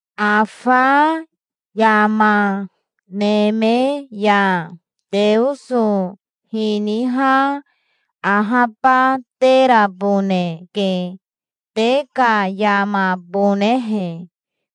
Afa yama neme ya Teoso hiniha ahabateraboneke, te ka yamabonehe.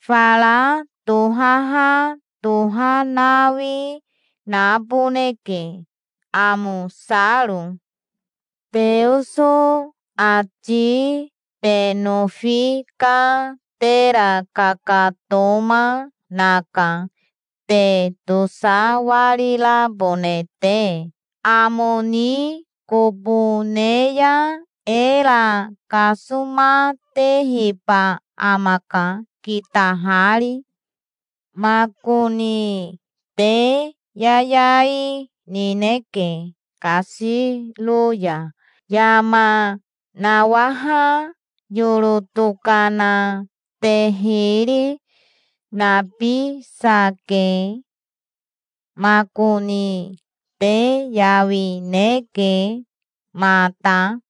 Fara tohaha tohanawi naboneke, amosaro. Teoso ati te nofi ka tera kakatoma, naka, te tosawarirabone te. Amo ni kobo ne ya era kasomatehiba amaka, kitahari. Makoni te yayai nineke kasiro ya. Yama nawaha yoro tokana te hiri nabisake. Makoni te yawineke mata.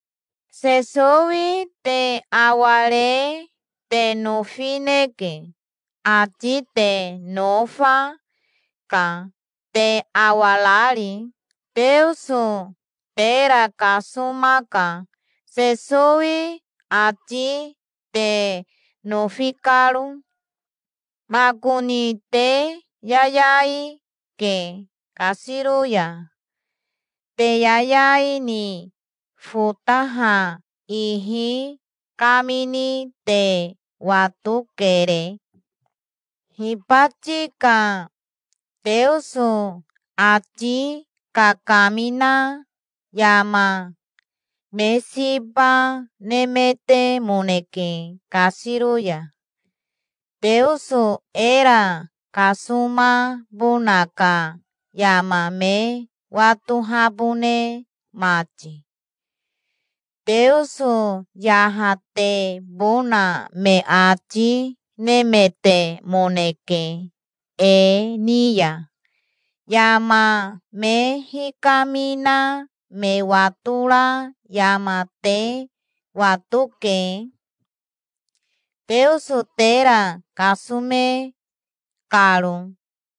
Sesowi te aware te nofineke. Ati te nofa, ka, te awarari. Teoso tera kasomaka, Sesowi ati te nofi karo. Makoni te yayai ke kasiro ya. Te yayai ni fotaha ihi kamini te watokere. Hibati ka Teoso ati kakamina yama me siba nemetemoneke kasiro ya, Teoso era kasomabona ka yama me watohabone mati. Teoso yahatebona me ati nemetemoneke e ni ya. Yama me hikamina me watora yama te watoke, Teoso tera kasome karo.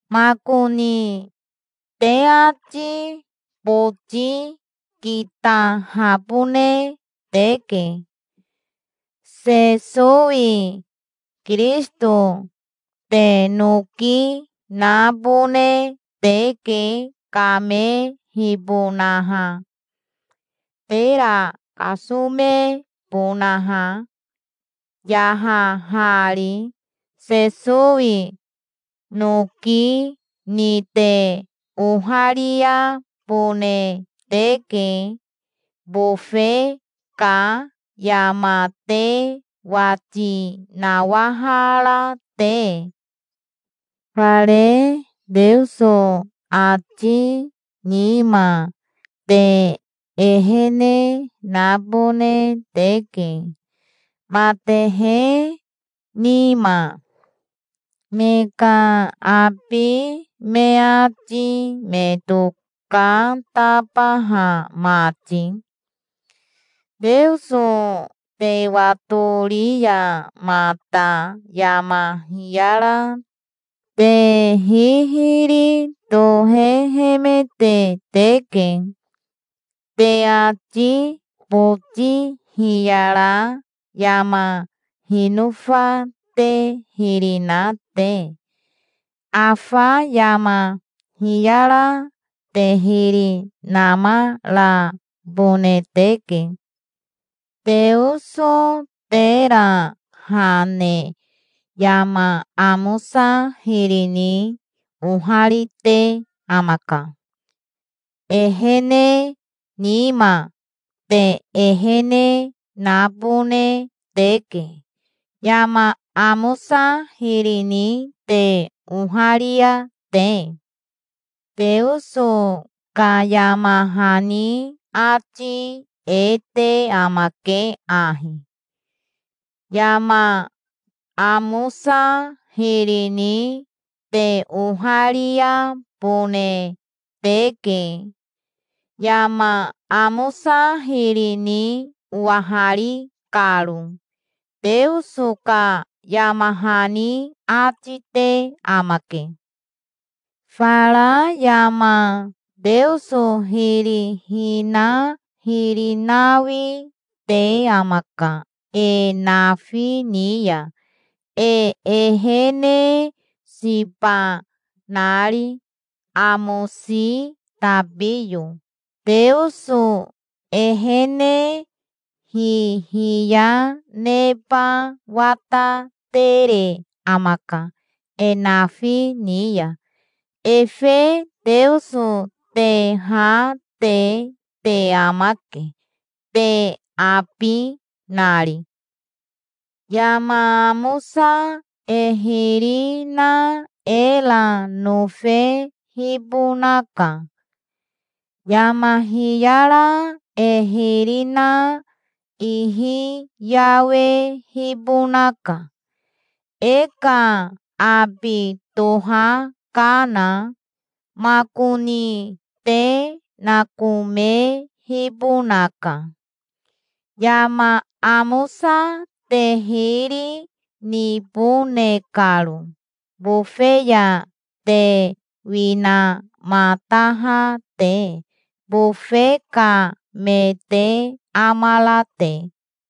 Makoni te ati boti kitahabone teke. Sesowi Kirisito te noki nabone teke kamehibonaha, tera kasomebonaha, yahahari. Sesowi noki ni te ohariabone teke, bofe ka yama te wati nawahara te. Fare Teoso ati nima te ehene nabone teke matehe nima, me ka abi me ati me tokatabaha mati. Teoso te watori ya mata yama hiyara te hihiri tohehemete teke, te ati boti hiyara yama hinofa te hiri na te. Afa yama hiyara te hiri namarabone teke. Teoso tera ha ne yama amosa hiri ni oharite amaka. Ehene nima te ehene nabone teke, yama amosa hiri ni te oharia te. Teoso ka yama hani ati e te amake ahi: "Yama amosa hiri ni te ohariabone teke, yama amosa hiri ni owahari karo", Teoso ka yama hani ati te amake. Fara yama Teoso hiri hina hiri nawi te amaka e nafi ni ya, e ehene siba nari, amosi tabiyo. Teoso ehene hihiya neba watatere amaka e nafi ni ya. Efe Teoso te ha te te amake, te abi nari. Yama amosa e hiri na era nofehibonaka. Yama hiyara e hiri na ihi yawehibonaka, e ka abi tohakana. Makoni te nakomehibonaka, yama amosa te hiri nibone karo, bofe ya te winamataha te, bofe ka me te amara te.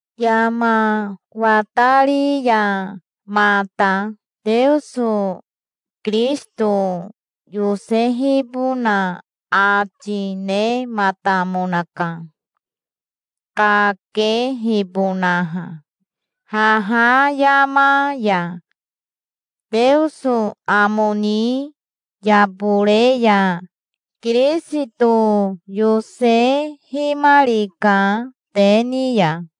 Yama watari ya mata Teoso Kirisito yosehibona ati nematamonaka, kakehibonaha. Haha yama ya Teoso amo ni yabore ya Kirisito yosehimarika te ni ya.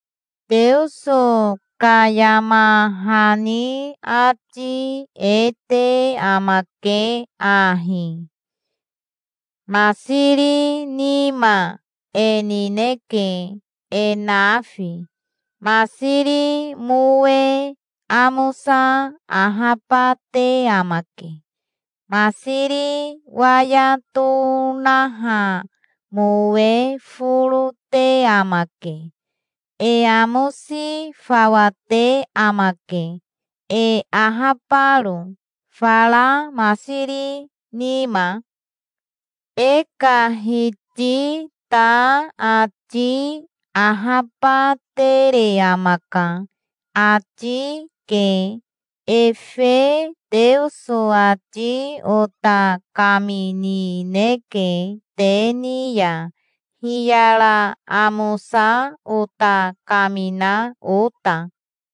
Teoso ka yama hani ati e te amake ahi: "Masiri nima e nineke e nafi. Masiri mowe amosa ahabate amake. Masiri waya tonaha mowe foro te amake. E amosi fawa te amake, e ahabaro, fara masiri nima. E ka Hiti ta ati ahabatere amaka", ati ke. Efe Teoso ati ota kaminineke te ni ya, hiyara amosa ota kamina ota.